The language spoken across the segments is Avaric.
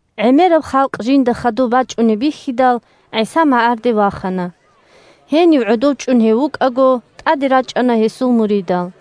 ГӀемераб халкъ жинда хадуб бачӀунеб бихьидал, ГӀиса магӀарде вахана. Гьенив гӀодов чӀун гьев вукӀаго, тӀаде рачӀана гьесул муридал.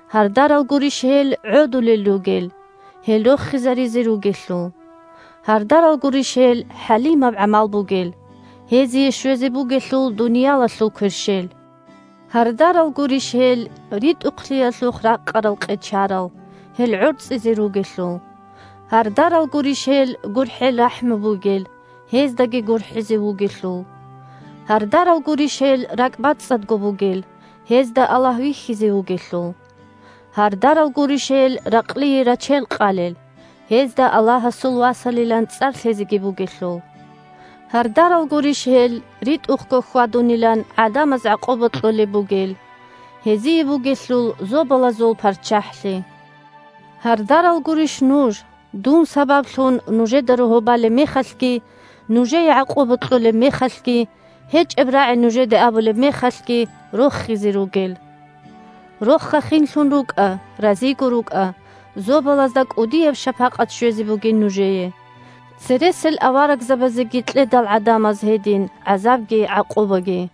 Гьардарал гурищ гьел, гӀодулел ругел, – гьел рохизаризе ругелъул. Гьардарал гурищ гьел, хӀалимаб гӀамал бугел, – гьезие щвезе бугелъул дуниялалъул кверщел. Гьардарал гурищ гьел, ритӀухълъиялъухъ ракъарал-къечарал, – гьел гӀорцӀизе ругелъул. Гьардарал гурищ гьел, гурхӀел-рахӀму бугел, – гьездаги гурхӀизе вугелъул. Гьардарал гурищ гьел, ракӀ бацӀцӀадго бугел, – гьезда Аллагь вихьизе вугелъул. Гьардарал гурищ гьел, ракълие рачел къалел, – гьезда Аллагьасул васалилан цӀар лъезеги бугелъул. Гьардарал гурищ гьел, ритӀухъго хьвадунилан гӀадамаз гӀакъуба кьолеб бугел, – гьезие бугелъул Зобалазул ПарччахӀлъи. Гьардарал гурищ нуж, – дун сабаблъун нужеда рогьо балеб мехалъги, нужее гӀакъуба кьолеб мехалъги, гьечӀеб рагӀи нужеде абулеб мехалъги – рохизе ругел. Роха-хинлъун рукӀа, разиго рукӀа, Зобалазда кӀудияб шапакъат щвезе бугин нужее. Цересел аварагзабазеги кьедал гӀадамаз гьедин гӀазабги гӀакъубаги.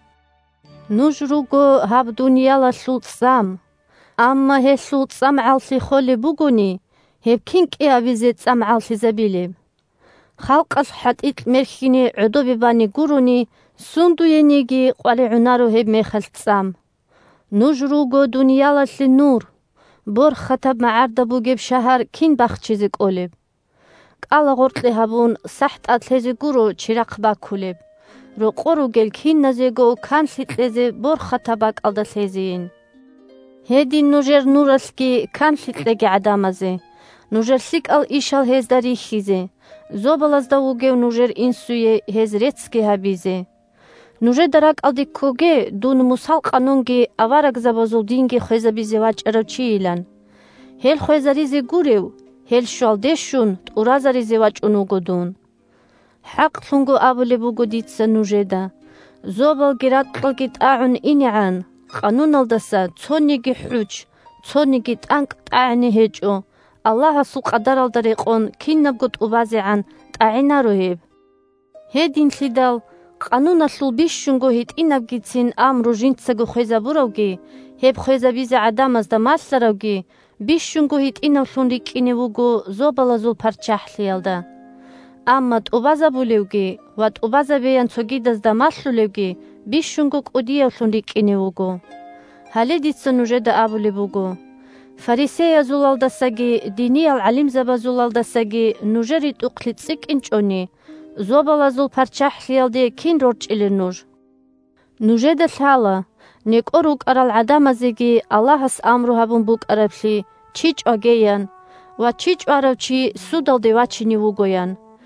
Нуж руго гьаб дуниялалъул цӀам. Амма гьелъул цӀамгӀаллъи холеб бугони, гьеб кин кӀиабизе цӀамгӀаллъизабилеб? Халкъалъ хӀатӀикь мерхьине гӀодобе бани гурони, сундуениги къваригӀунаро гьебмехалъ цӀам. Нуж руго дуниялалъе нур. Борхатаб магӀарда бугеб шагьар кин бахчизе кӀолеб? КӀалагъоркье гьабун сахӀ тӀад лъезе гуро чирахъ бакулеб, рокъор ругел киназего канлъи кьезе борхатаб бакӀалда лъезейин. Гьедин нужер нуралъги канлъи кьеги гӀадамазе, нужер лъикӀал ишал гьезда рихьизе, зобалазда вугев нужер Инсуе гьез реццги гьабизе. Нужеда ракӀалде ккоге дун Мусал къанунги аварагзабазул динги хвезабизе вачӀарав чийилан. Гьел хвезаризе гурев, гьел щвалде щун тӀуразаризе вачӀун вуго дун. ХӀакълъун абулеб буго дица нужеда: зобалги ракьалги тӀагӀун инегӀан, къануналдаса цониги хӀучч, цониги тӀанкӀ тӀагӀине гьечӀо, Аллагьасул къадаралда рекъон кинабго тӀубазегӀан тӀагӀинаро гьеб. Гьединлъидал къануналъул бищунго гьитӀинабгицин амру жинцаго хвезабуравги гьеб хвезабизе гӀадамазда малъаравги бищунго гьитӀинавлъун рикӀкӀине вуго Зобалазул ПарччахӀлъиялда. Амма тӀубазабулевги ва тӀубазабеян цогидазда малъулевги бищунго кӀудиявлъун рикӀкӀине вуго. Гьале дица нужеда абулеб буго: фарисеязулалдасаги диниял гӀалимзабазулалдасаги нужер ритӀухълъи цӀикӀкӀинчӀони, Зобалазул ПарччахӀлъиялде кин рорчӀилел нуж? Нужеда лъала: некӀо рукӀарал гӀадамазеги Аллагьас амру гьабун букӀараблъи: «Чи чӀваге!» – ян ва: «Чи чӀварав чи судалде вачине вуго», – ян.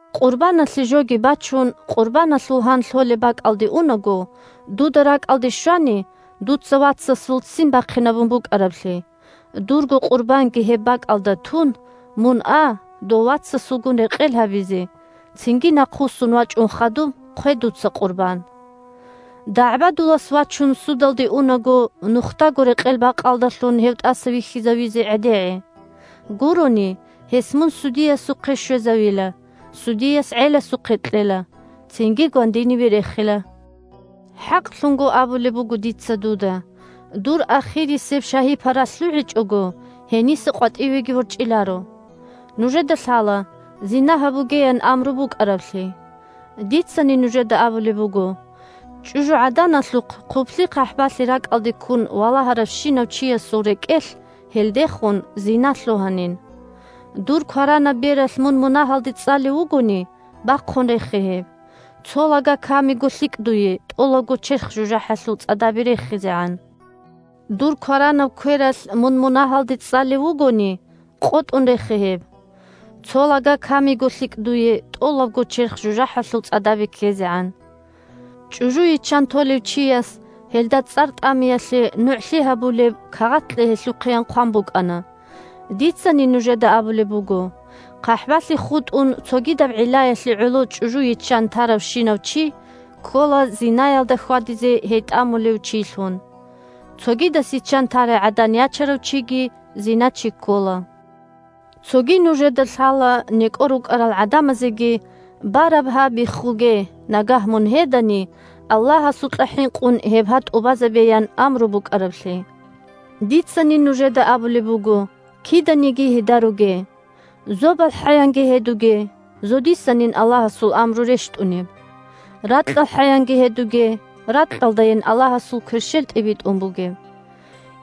Къурбаналъе жоги бачун, къурбаналъул гьан лъолеб бакӀалде унаго, дуда ракӀалде щвани дуца вацасул ццин бахъинабун букӀараблъи, дурго къурбанги гьеб бакӀалда тун, мун а дов вацасулгун рекъел гьабизе, цинги нахъвуссун вачӀун хадуб хъве дуца къурбан. ДагӀбадулас вачун, судалде унаго, нухдаго рекъел-бакъалдалъун гьев тӀаса вихьизавизе гӀедегӀе. Гурони, гьес мун судиясухъе щвезавила, судияс гӀеласухъе кьела, цинги гвандиниве рехила. ХӀакълъун абулеб буго дица дуда: дур ахирисеб шагьи-пара лъугӀичӀого, гьениса къватӀивеги ворчӀиларо. Нужеда лъала: «зина гьабуге», – ян амру букӀараблъи. Дицани нужеда абулеб буго: чӀужугӀаданалъухъ хъублъи-хъахӀбалъи ракӀалде ккун валагьаравщинав чиясул рекӀелъ гьелдехун зина лъугьанин. Дур кваранаб бералъ мун мунагьалде цӀалев вугони, бахъун рехе гьеб. Цо лага камиго лъикӀ дуе, тӀолабго черх жужахӀалъул цӀадабе рехизегӀан. Дур кваранаб квералъ мун мунагьалде цӀалев вугони, къотӀун рехе гьеб. Цо лага камиго лъикӀ дуе, тӀолабго черх жужахӀалъул цӀадабе ккезегӀан. ЧӀужу йиччан толев чияс гьелда цӀар тӀамиялъе нугӀлъи гьабулеб кагъат кье гьелъухъеян хъван букӀана. Дицани нужеда абулеб буго: хъахӀбалъи хутӀун, цогидаб гӀиллаялъе гӀоло чӀужу йиччан таравщинав чи ккола зинаялда хьвадизе гьей тӀамулев чилъун. Цогидас йиччан тарай гӀадан ячарав чиги зиначи ккола. Цоги нужеда лъала некӀо рукӀарал гӀадамазеги: «Бараб гьа биххуге, нагагь мун гьедани, Аллагьасукьа хӀинкъун гьеб гьа тӀубазабе» – ян амру букӀараблъи. Дицани нужеда абулеб буго: киданиги гьедаруге. ЗобалхӀаянги гьедуге – зодисанин Аллагьасул амру рещтӀунеб. РакьалхӀаянги гьедуге – ракьалдайин Аллагьасул кверщел тӀибитӀун бугеб.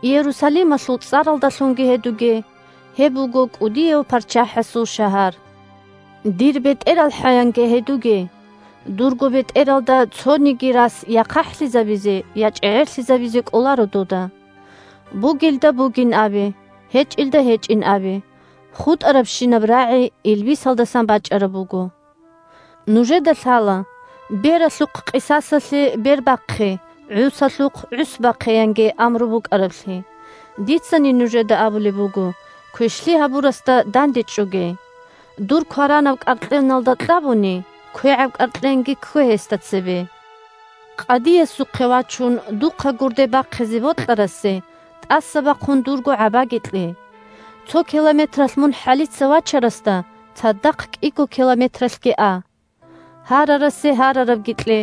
Иерусалималъул цӀаралдалъунги гьедуге – гьеб буго кӀудияв ПарччахӀасул шагьар. «Дир бетӀералхӀа», – янги гьедуге, дурго бетӀералда цониги рас я хъахӀлъизабизе, я чӀегӀерлъизабизе кӀоларо дуда. Бугелда бугин абе, гьечӀелда гьечӀин абе, хутӀарабщинаб рагӀи илбисалдасан бачӀараб буго. Нужеда лъала: «Бералъухъ къисасалъе бер бахъе, гӀусалъухъ гӀус бахъе», – янги амру букӀараблъи. Дицани нужеда абулеб буго: квешлъи гьабурасда дандечӀоге. Дур кваранаб кӀаркьеналда кьабуни, квегӀаб кӀаркьенги ккве гьесда цебе. Къадиясухъе вачун, духъа гурде бахъизе бокьарасе, тӀаса бахъун дурго гӀабаги кье. Цо километралъ мун хӀалица вачарасда цадахъ кӀиго километралъги а. Гьарарасе гьарарабги кье,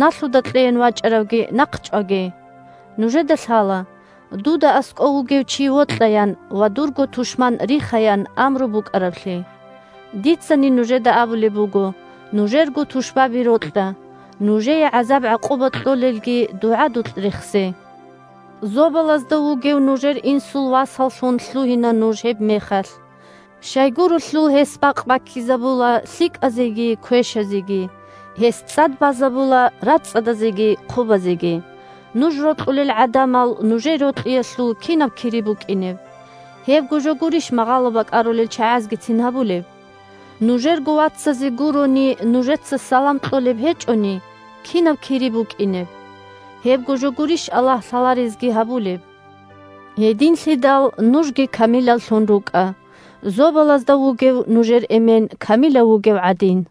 налъуда кьеян вачӀаравги нахъчӀваге. Нужеда лъала: «Дуда аскӀов вугев чи вокьа» – ян ва «дурго тушман риха», – ян амру букӀараблъи. Дицани нужеда абулеб буго: нужерго тушбаби рокьа, нужее гӀазаб-гӀакъуба кьолелги дугӀадулъ рехсе. Зобалазда вугев нужер Инсул васаллъун лъугьина нуж гьебмехалъ. Щайгурелъул гьес бакъ баккизабула лъикӀазеги квешазеги, гьес цӀад базабула рацӀцӀадазеги хъубазеги. Нуж рокьулел гӀадамал нужее рокьиялъул кири кинаб букӀинеб? Гьебго жо гурищ магъало бакӀарулел чагӀазгицин гьабулеб? Нужерго вацазе гурони нужеца салам кьолеб гьечӀони, кири кинаб букӀинеб? Гьебго жо гурищ Аллагь лъаларезги гьабулеб? Гьединлъидал нужги камилаллъун рукӀа, Зобалазда вугев нужер Эмен камилав вугев гӀадин.